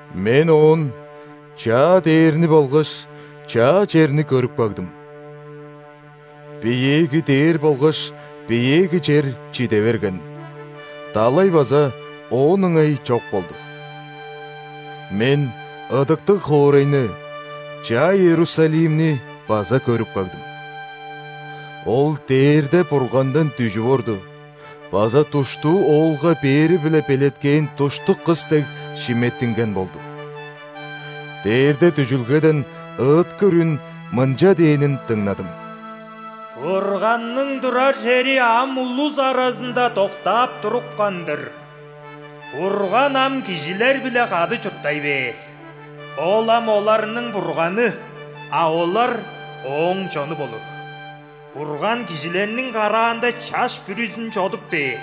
Мен оон чаа дээрни болгаш чаа черни көрүп кагдым. Биеэги дээр болгаш биеэги чер чиде берген, далай база оон ыңай чок болду. Мен ыдыктыг хоорайны, чаа Иерусалимни, база көрүп кагдым. Ол дээрде Бургандан дүжүп орду база душтуу оолга бээри-биле белеткээн душтук кыс дег шиметтинген болду. Дээрде дүжүлгеден ыыткыр үн мынча дээнин дыңнадым: «Бурганның турар чери ам улус аразында доктаап турупкан-дыр. Бурган ам кижилер-биле кады чурттай бээр, Ол ам оларның Бурганы, а олар Ооң чону болур. Бурган кижилерниң караанда чаш бүрүзүн чодуп бээр.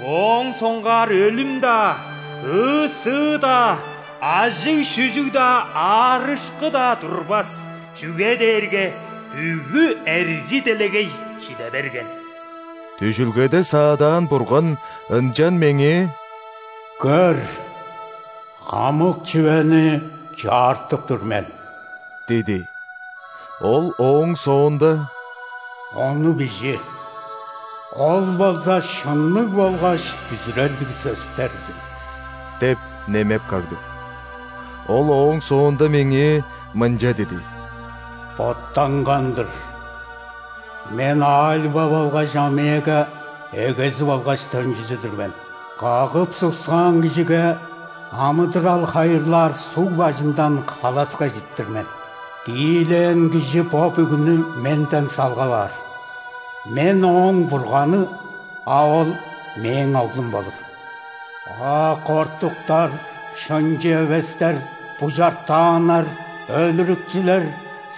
Моон соңгаар өлүм-даа, ыы-сыы-даа, ажыг-шүжүг-даа, аарышкы-даа турбас, чүге дээрге бүгү эрги делегей чиде берген». Дүжүлгеде саадаан Бурган ынчан меңээ: «Көр! Хамык чүвени чаартып тур мен!» – диди. Ол ооң соонда: «Ону бижи, ол болза шынныг болгаш бүзүрелдиг сөстер-дир» – деп немеп кагды. Ол ооң соонда меңээ мынча диди: «Боттанган-дыр! Мен Альфа болгаш Омега, эгези болгаш төнчүзү-дүр мен. Кагып-суксаан кижиге амыдырал хайырлаар суг бажындан халаска ижиртир мен. Тиилээн кижи бо бүгүнү Менден салгап аар. Мен – ооң Бурганы, а ол – Мээң оглум болур. А кортуктар, шынчы эвестер, бужартааннар, өлүрүкчүлер,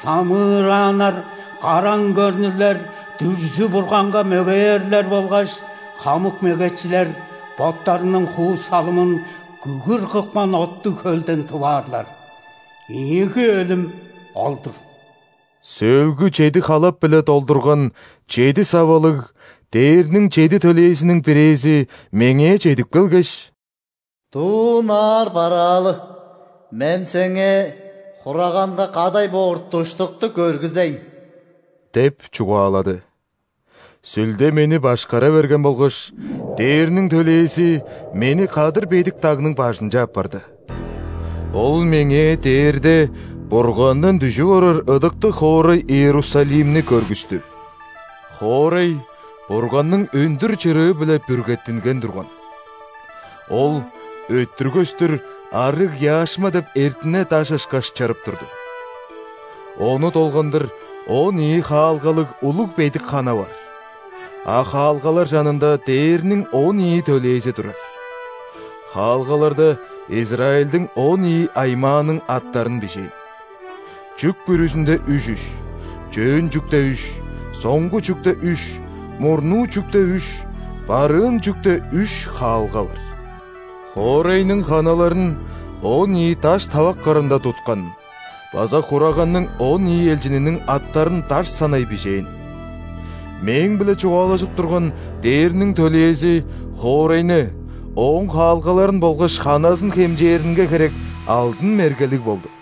самыырааннар, караң көрнүрлер, дүрзү-бурганга мөгеерлер болгаш хамык мегечилер боттарының хуу-салымын күгүр кыпкан оттуг хөлден тып аарлар. Ийиги өлүм ол-дур». Сөөлгү чеди халап-биле долдурган чеди савалыг дээрниң чеди төлээзиниң бирээзи меңээ чедип келгеш: «Дуу ынаар бараалы, мен сеңээ Хураганга кадай боор душтукту көргүзейн» – деп чугаалады. Сүлде мени башкара берген болгаш, ·дээрниң төлээзи мени кадыр бедик дагның бажынче аппарды. Ол меңээ дээрде Бургандан дүжүп орар ыдыктыг хоорай Иерусалимни көргүстү. Хоорай Бурганның өндүр чырыы-биле бүргеттинген турган. Ол өттүр көстүр арыг яшма деп эртине даш ышкаш чырып турду. Ону долгандыр он ийи хаалгалыг улуг бедик хана бар, а хаалгалар чанында дээрниң он ийи төлээзи турар. Хаалгаларда Израильдиң он ийи аймааның аттарын бижээн. Чүк бүрүзүнде үш-үш: чөөн чүкте – үш, соңгу чүкте – үш, мурнуу чүкте – үш, барыын чүкте – үш хаалга бар. Хоорайның ханаларын он ийи даш тавак кырында туткан база Хураганның он ийи элчининиң аттарын даш санай бижээн. Мээң-биле чугаалажып турган дээрниң төлээзи хоорайны, ооң хаалгаларын болгаш ханазын хемчээринге херек алдын мергелиг болду.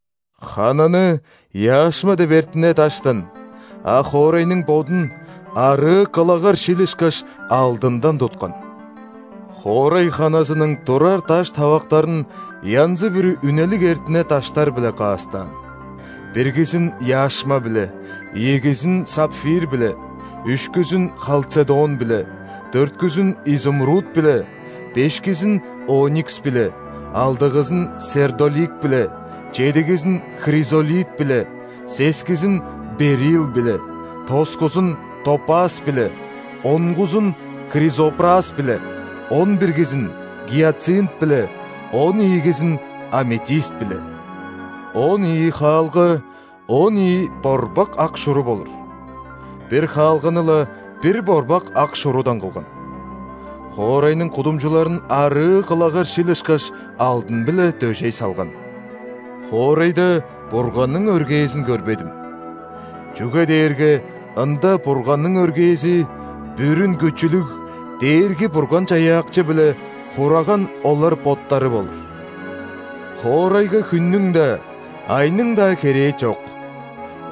Хананы яшма деп эртине даштан, а хоорайның бодун арыы кылагар шил ышкаш алдындан туткан. Хоорай ханазының турар даш тавактарын янзы-бүрү үнелиг эртине даштар-биле каастаан: биргизин – яшма-биле, ийигизин – сапфир-биле, үшкүзүн – халцедон-биле, дөрткүзүн – изумруд-биле, бешкизин – оникс-биле, алдыгызын – сердолик-биле, чедигизин – хризолит-биле, сескизин – берилл-биле, тоскузун – топаз-биле, онгузун – хризопраз-биле, он биргизин – гиацинт-биле, он ийигизин – аметист-биле. Он ийи хаалга он ийи борбак ак шуру болур: бир хаалганы-ла бир борбак ак шурудан кылган. Хоорайның кудумчуларын арыы кылагар шил ышкаш алдын-биле дөжей салган. Хоорайда Бурганның өргээзин көрбедим, чүге дээрге ында Бурганның өргээзи – Бүрүн Күчүлүг Дээрги-Бурган-Чаяакчы биле Хураган олар боттары болур. Хоорайга хүннүң-даа, айның-даа херээ чок,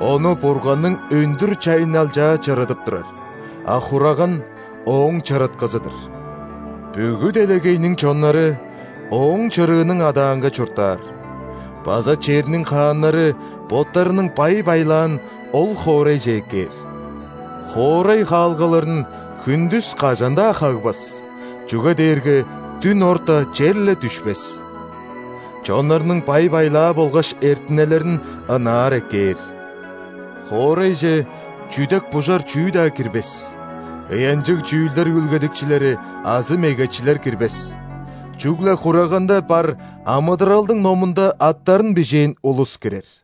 ону Бурганның өндүр чайынналчаа чырыдып турар, а Хураган – ооң чырыткызы-дыр. Бүгү делегейниң чоннары Ооң чырыының адаанга чурттаар база черниң хааннары боттарының бай-байлаан ол хоорайже эккээр. Хоорай хаалгаларын хүндүс кажан-даа хагбас, чүге дээрге дүн орта черле дүшпес. Чоннарның бай-байлаа болгаш эртинелерин ынаар эккээр. Хоорайже чүдек-бужар чүү-даа кирбес, ыянчыг чүүлдер үүлгедикчилери азы мегечилер кирбес, чүгле Хураганда бар амыдыралдың номунда аттарын бижээн улус кирер.